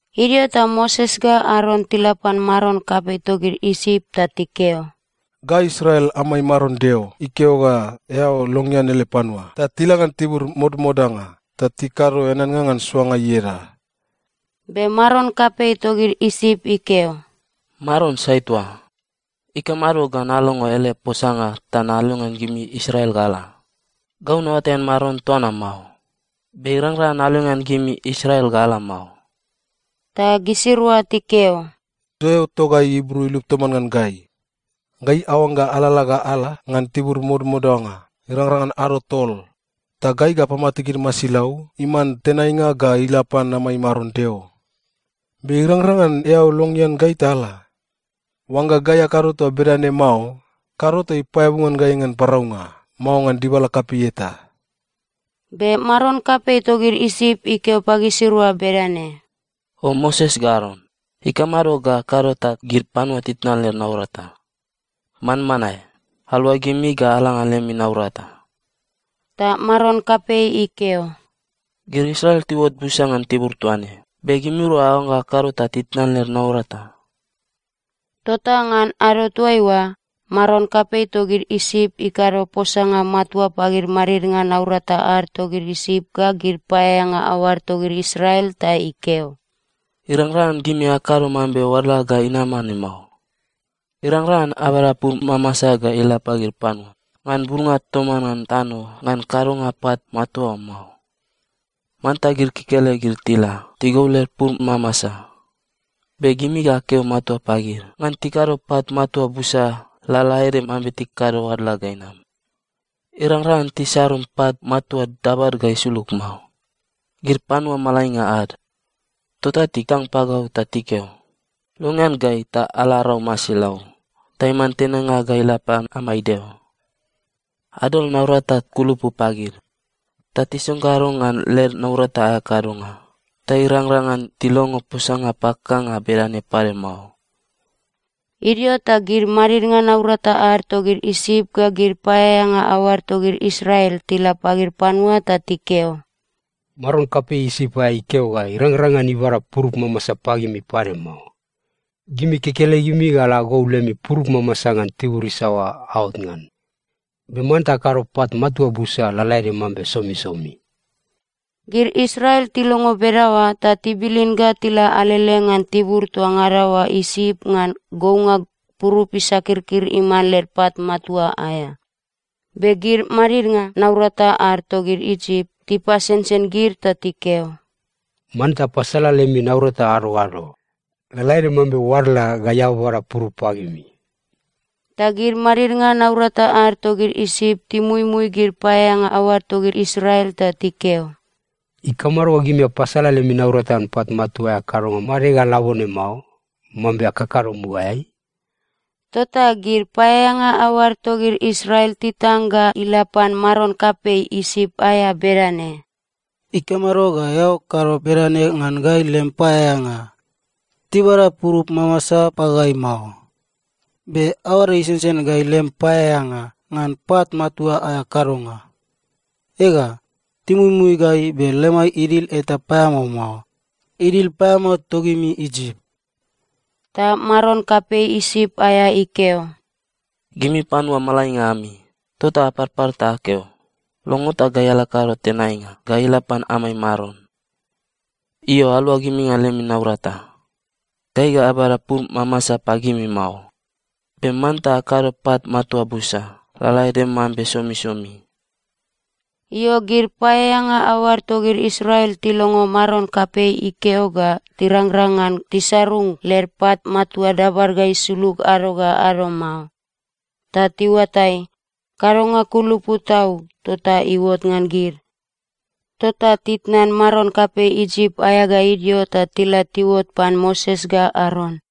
Idio ta Moses ga Aron tila pan maron kapei togid Isip ta tikeo, “Gai Israel amai Maron Deo ikeo ga eao longean ele panua ta tila ngan tibur modamodanga ta tikado eaneannga ngan soanga ieda.” Be maron kapei togid Isip ikeo, “Maron sai toa? Ikamado ga nalongo ele posanga ta nalongean gimi Israel ga ala? Gau naoatai ngan Maron toa na mao. Be irangrang ngan nalongean gimi Israel ga ala mao.” Ta gisirua tikeo, “Deo togai Ibru ilup toman ngan gai. Gai aoangga alalala ga ala ngan tibur modamodanga irangrang ngan ado tol, ta gai ga apamate gid masilau iman tenainga ga ila pan amai Maron Deo. Be irangrang ngan eao longean gai ta ala? Oangga gai akado toa bedane mao, kado ta ipaeabu ngan gai ngan paraunga, mao ngan dibala kapei eta.” Be maron kapei togid Isip ikeo pagisirua bedane, “O Moses ga Aron, ikamado ga akado ta gid panua titnan led naurata? Manmanae, aluagimi ga ala ngan lemi naurata!” Ta maron kapei ikeo, “Gid Israel tiuot busa ngan tibur toa ne, be gimirua aoangga akado ta titnan led naurata.” Tota ngan ado toaiua, maron kapei togid Isip ikado posanga matua pagid madidnga naurata ad togid Isip ga gid paeaeanga aoad togid Israel ta ikeo, “Irangrang ngan gimi akado mambe oadla ga inama ne mao. Irangrang ngan abada purup mamasa ga ila pagid panua ngan bulnga toman ngan tano ngan kadonga pat matua oa mao. Manta gid kekelegid tila tigou led purup mamasa. Be gimi ga akeo matua pagid ngan tikado pat matua busa lalaede mambe tikakado oadla ga inam. Irangrang ngan tisarung pat matua dabad ga isulug mao. Gid panua malainga ad, tota titang pagau ta tikeo, ‘Longean gai ta ala arau masilau ta iman tenainga ga ila pan amai Deo.’ Adol naurata kulupu pagid ta tisonggaro ngan led naurata aea kadonga ta irangrang ngan tilongo posanga pakakanga bedane pade mao.” Idio ta gid madidnga naurata ad togid Isip ga gid paeaeanga aoad togid Israel tila pagid panua ta tikeo, “Maron kapei Isip aea ikeo ga irangrang ngan ibada purup mamasa pagimi pade mao. Gimi kekelegimi ga ala agou lemi purup mamasa ngan tibur isaoa aot ngan. Be manta akado pat matua busa lalaede mambe somisomi.” Gid Israel tilongo bedaoa ta tibilin ga tila alele ngan tibur toa ngada oa Isip ngan gounga purup isakirkir iman led pat matua aea. Be gid madidnga naurata ad togid Isip tipasensen gid ta tikeo, “Manta apasala lemi naurata ado ga ado, lalaede mambe oadla gai ababada purup pagimi.” Ta gid madidnga naurata ad togid Isip timuimui gid paeaeanga aoad togid Israel ta tikeo, “Ikamado ga gimi apasala lemi naurata ngan pat matua aea kadonga made ga labone mao, mambe akakado mugaeai?” Tota gid paeaeanga aoad togid Israel titang ga ila pan maron kapei Isip aea bedane, “Ikamado ga eao kado bedane ngan gai lem paeaeanga? Tibada purup mamasa pagai mao, be aoad isensen gai, lem paeaeanga, ngan pat matua aea kadonga. Ega, timuimui gai, be lemai idil eta paeamao mao. Idil paeamao togimi Isip.” Ta maron kapei Isip aea ikeo, “Gimi panua malainga ami! Tota aparpar ta akeo, ‘Longo ta gai ala akado tenainga ga ila pan amai Maron.’ Io, aluagimi ngan lemi naurata! Gai ga abada purup mamasa pagimi mao, be manta akado pat matua busa lalaede mambe somisomi.” Io, gid paeaeanga aoad togid Israel tilongo maron kapei ikeo ga tirangrang ngan tisarung led pat matua dabad ga isulug ado ga ado mao, ta tiuatai, kadonga kulupu tau tota iuot ngan gid. Tota titnan maron kapei Isip aea ga idio, ta tila tiuot pan Moses ga Aron.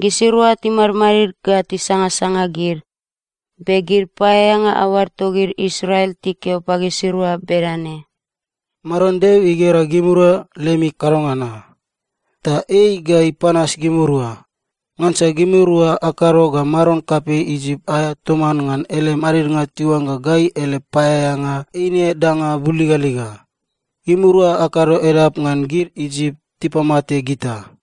Gisirua timadmadid ga tisangasanga gid, be gid paeaeanga aoad togid Israel tikeo pagisirua bedane, “Maron Deo igera gimirua lemi kadonga na. Ta ei ga ipanas gimirua. Ngansa gimirua akado ga maron kapei Isip aea toman ngan ele madidnga tiuangga gai ele paeaeanga eine danga buligaliga. Gimirua akado edap ngan gid Isip tipamate gita.”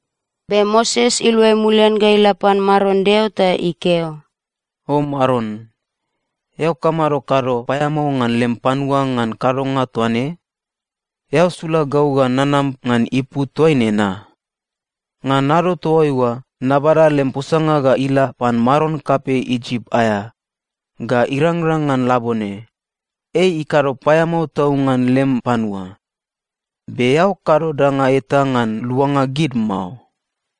Be Moses iluai mulian ga ila pan Maron Deo ta ikeo, “O Maron, eao kamado kado paeamao ngan lem panua ngan kadonga toa ne? Eao sula gau ga nanam ngan ipu toaine na? Ngan ado toaiua nabada lem posanga ga ila pan maron kapei Isip aea, ga irangrang ngan labone, ei ikado paeamao tau ngan lem panua. Be eao kado danga eta ngan luanga gid mao.”